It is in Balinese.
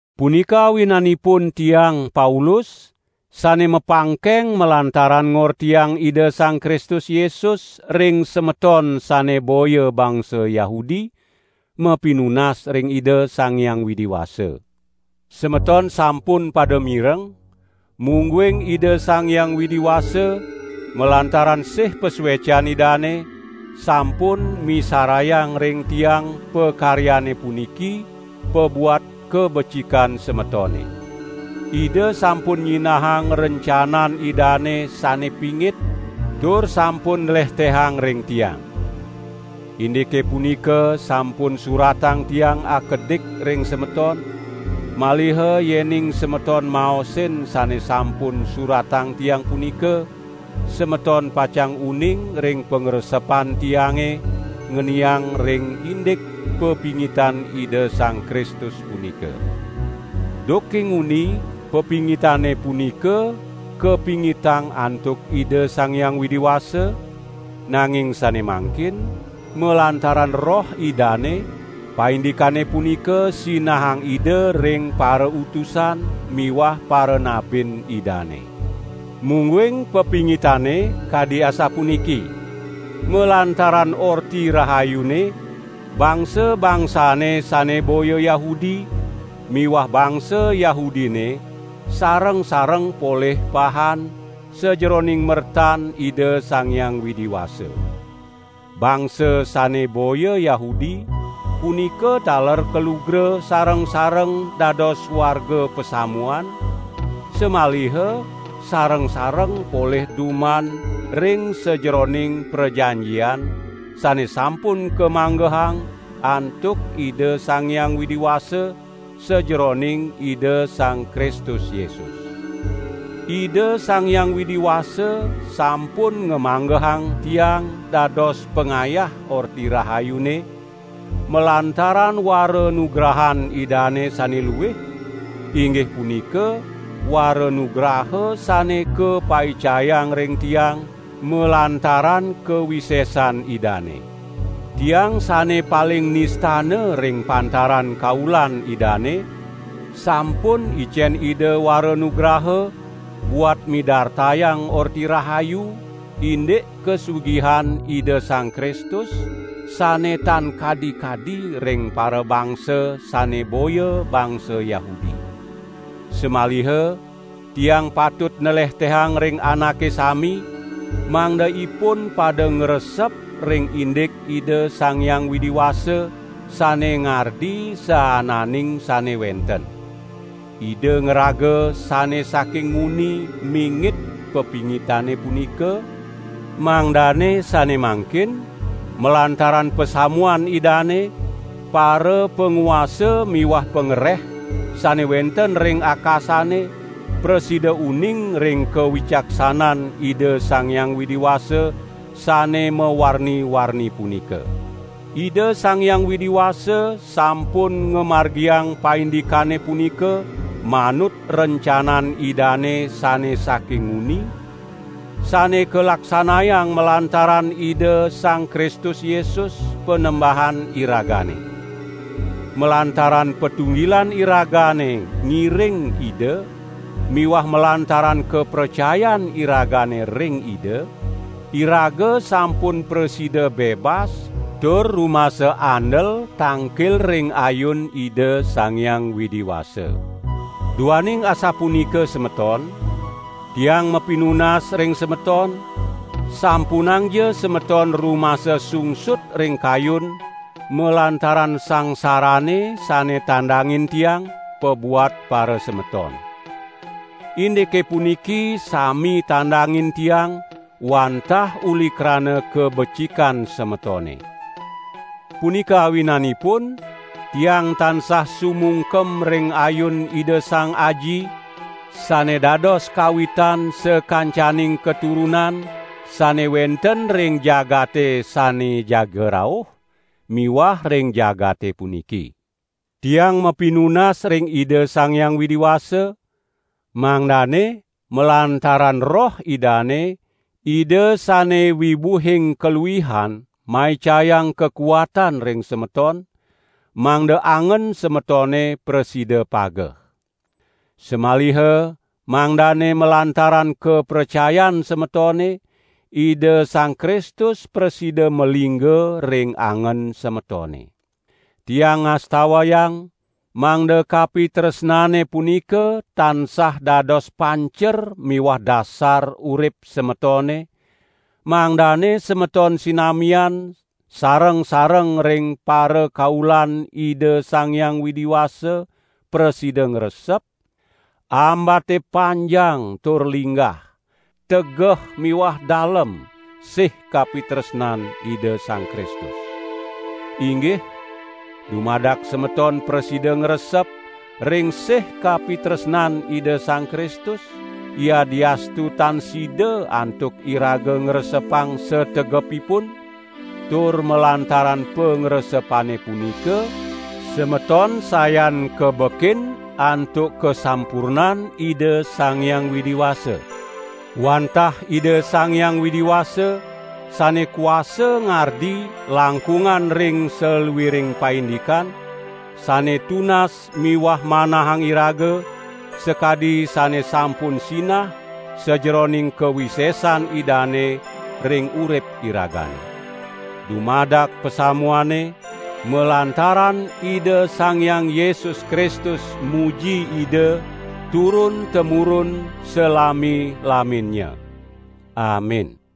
Punika awinanipun tiang, Paulus, sane mapangkeng malantaran ngortiang Ida Sang Kristus Yesus ring semeton sane boya bangsa Yahudi, mapinunas ring Ida Sang Hyang Widi Wasa. Semeton sampun pada mireng, mungguing Ida Sang Hyang Widi Wasa, malantaran sih pasuecan Idane, sampun misarayang ring tiang pakaryane puniki pabuat kabecikan semetone. Ida sampun nyinahang rencanan Idane sane pingit tur sampun nlehtehang ring tiang. (Indike punika sampun suratang tiang akedik ring semeton, maliha yening semeton maosin sane sampun suratang tiang punika, semeton pacang uning ring pangresepan tiange ngeniang ring indik pepingitan Ida Sang Kristus punika.) Duke nguni pepingitane punika kapingitang antuk Ida Sang Hyang Widi Wasa, nanging sane mangkin malantaran Roh Idane paindikane punika sinahang Ida ring parautusan miwah paranabin Idane. Mungguing pepingitane kadi asapuniki: malantaran Orti Rahayune, bangsa-bangsane sane boya Yahudi miwah bangsa Yahudine sareng-sareng polih pahan sajeroning mertan Ida Sang Hyang Widi Wasa. Bangsa sane boya Yahudi punika taler kalugra sareng-sareng dados warga pasamuan, samaliha sareng-sareng polih duman ring sajeroning prajanjian sane sampun kamanggehang antuk Ida Sang Hyang Widi Wasa sajeroning Ida Sang Kristus Yesus. Ida Sang Hyang Widi Wasa sampun ngamanggehang tiang dados pangayah Orti Rahayune malantaran waranugrahan Idane sane luih, inggih punika waranugraha sane kapaicayang ring tiang malantaran kawisesan Idane. Tiang sane paling nistana ring pantaran kaulan Idane sampun icen Ida waranugraha buat midartayang Orti Rahayu indik kasugihan Ida Sang Kristus sane tan kadi-kadi ring parabangsa sane boya bangsa Yahudi. Samaliha tiang patut nlehtehang ring anake sami, mangda ipun pada ngresep ring indik Ida Sang Hyang Widi Wasa sane ngardi saananing sane wenten. Ida ngraga sane saking nguni mingit pepingitane punika, mangdane sane mangkin malantaran pasamuan Idane, parapanguasa miwah pangreh sane wenten ring akasane prasida uning ring kawicaksanan Ida Sang Hyang Widi Wasa sane mawarni-warni punika. Ida Sang Hyang Widi Wasa sampun ngamargiang paindikane punika manut rencanan Idane sane saking nguni, sane kalaksanayang malantaran Ida Sang Kristus Yesus, Panembahan iragane. Malantaran patunggilan iragane ngiring Ida miwah malantaran kapracayan iragane ring Ida, iraga sampun prasida bebas tur rumasa andel tangkil ring ayun Ida Sang Hyang Widi Wasa. Duaning asapunika semeton, tiang mapinunas ring semeton, sampunangja semeton rumasa sungsut ring kayun malantaran sangsarane sane tandangin tiang, pabuat parasemeton. Indike puniki sami tandangin tiang wantah uli krana kabecikan semetone. Punika awinanipun tiang tansah sumungkem ring ayun Ida Sang Aji, sane dados kawitan sakancaning katurunan sane wenten ring jagate sane jaga rauh miwah ring jagate puniki. Tiang mapinunas ring Ida Sang Hyang Widi Wasa, mangdane malantaran Roh Idane, Ida sane wibuhing kaluihan maicayang kakuatan ring semeton, mangda angen semetone prasida pageh. Samaliha mangdane malantaran kapracayan semetone, Ida Sang Kristus prasida malingga ring angen semetone. Tiang ngastawayang, mangda kapitresnane punika tansah dados pancer miwah dasar urip semetone, mangdane semeton sinamian sareng-sareng ring parakaulan Ida Sang Hyang Widi Wasa prasida ngresep, ambate panjang tur linggah, tegeh miwah dalem sih kapitresnan Ida Sang Kristus. Inggih, dumadak semeton prasida ngresep ring sih kapitresnan Ida Sang Kristus, yadiastu tan sida antuk iraga ngresepang sategepipun, tur malantaran pangresepane punika, semeton sayan kabekin antuk kasampurnan Ida Sang Hyang Widi Wasa. Wantah Ida Sang Hyang Widi Wasa, sane kuasa ngardi langkungan ring saluiring paindikan, sane tunas miwah manahang iraga, sakadi sane sampun sinah sajeroning kawisesan Idane ring urip iragane. Dumadak pasamuane, malantaran Ida Sang Hyang Yesus Kristus muji Ida, turun-temurun salami-laminnya. Amin!